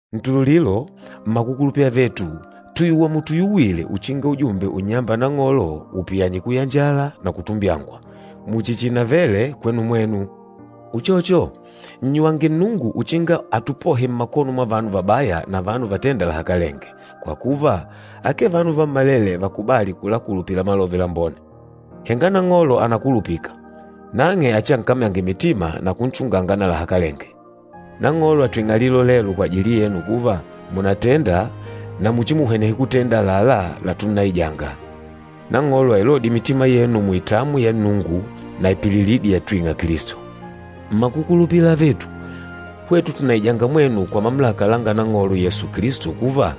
Ntululilo, mmakukulupila avetu, tùyuwa mutuyuwile uchinga ujumbe unnyâmba Nang'olo upiyanye kuyanjala na kutumbyangwa, muchi chiinavele kwenu mwenu. Uchocho, nnyuwange Nnungu uchinga atupohe mmakono mwa vanu vabaya na vanu vatênda lahakalenge. Kwa kuva, akee vanu vammalele vakubâli kulakulupila Malove Lambone. Henga Nang'olo ànakulupika, nang'e achiankamyange mitima na kunchunganga na lahakalenge. Nang'olo àtwing'a lilolelo kwajili yenu kuva, mùnatenda na muchimuhwenehe kutenda àlalá latunnaijanga. Nang'olo ailodye mitima yenu muitamwi ya Nnungu na ipililidi yatwing'a Kilisto. Mmakukulupila avetu, hwetu tùnnaija mwenu kwa mamulaka langa Nang'olo Yesu Kilisto kuva,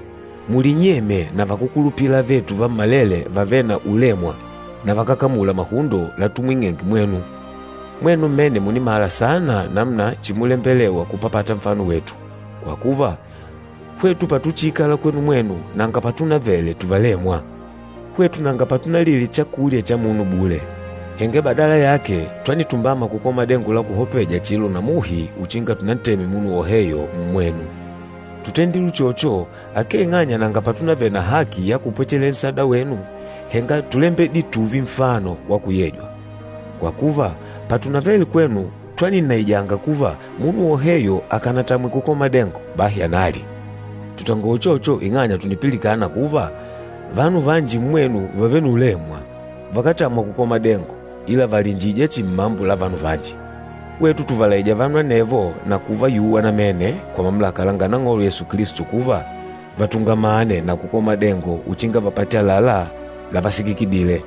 mulinyemye na vakúkulupila avetu vammalele vavêle na ulemwa na vakákamula mahundo latumwing'enge mwenu. Mwenu mmene mùnimala saana namuna chimulembelewa kupapata nfano wetu. Kwa kuva, hwetu patuchiikala kwenu mwenu nanga patunavele tuvalemwa. Hwetu nanga patunalile chakulya cha munu bule, henga badala yake twanitumbama kukola madengo la kuhopeja, chilo na muhi uchinga tunanteme munu woheyo mmwenu. Tútendile uchocho, akee ing'anya nanga patunavele na haki ya kupwechelela nsada wenu, henga túlembedile tùùve nfano wa kuyejwa. Kwa kuva, patunavele kwenu twaninnaijanga kuva, munu woheyo akànatamwe kukola madengo, bahi analye. Tùtangola uchocho ing'anya tùnipilikana kuva, vanu vanji mmwenu vàvele na ulemwa, vakátamwa kukola madengo, ila vàliinjija chihi mmambo la vanu vanji. Hwetu tùvalaija vanu anevo na kuvayuwa namene kwa mamulaka langa Nang'olo Yesu Kilisto kuva, vatungamane na kukola madengo uchinga vapate àlalá lavasikikidile.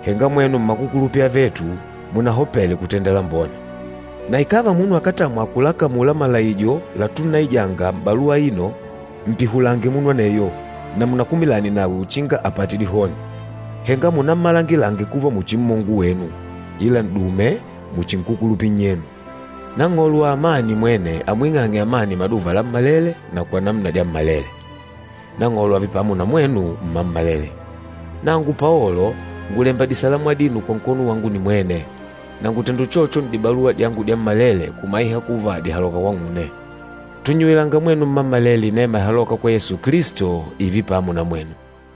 Henga mwenu mmakukulupila avetu, munahopele kutenda lambone. Na ikàva munu akátamwa kulakamula malaijo latunnaijanga m'baluwa aino, mpihulange munu aneyo na munakumilane nawe uchinga apate dihoni. Henga munammalangile kuva muchi mmongo wenu, ila n'dume muchi nkúkulupila nnyenu. Nang'olo wa amani mwene amwing'ange amani maduva lammalele na kwa namuna dyammalele. Nang'olo ààve pamo na mwenu mmammalele. Nangu Paolo ngùlemba disalamu adino kwa nkono wangu nimwene. Na ngùtenda uchocho n'dibaluwa dyangu dyammalele kumaiha kuva dìhaloka kwang'une. Tùnnyuwilanga mwenu mmammalele inema ihalôka kwa Yesu Kilisto, ììve pamo na mwenu.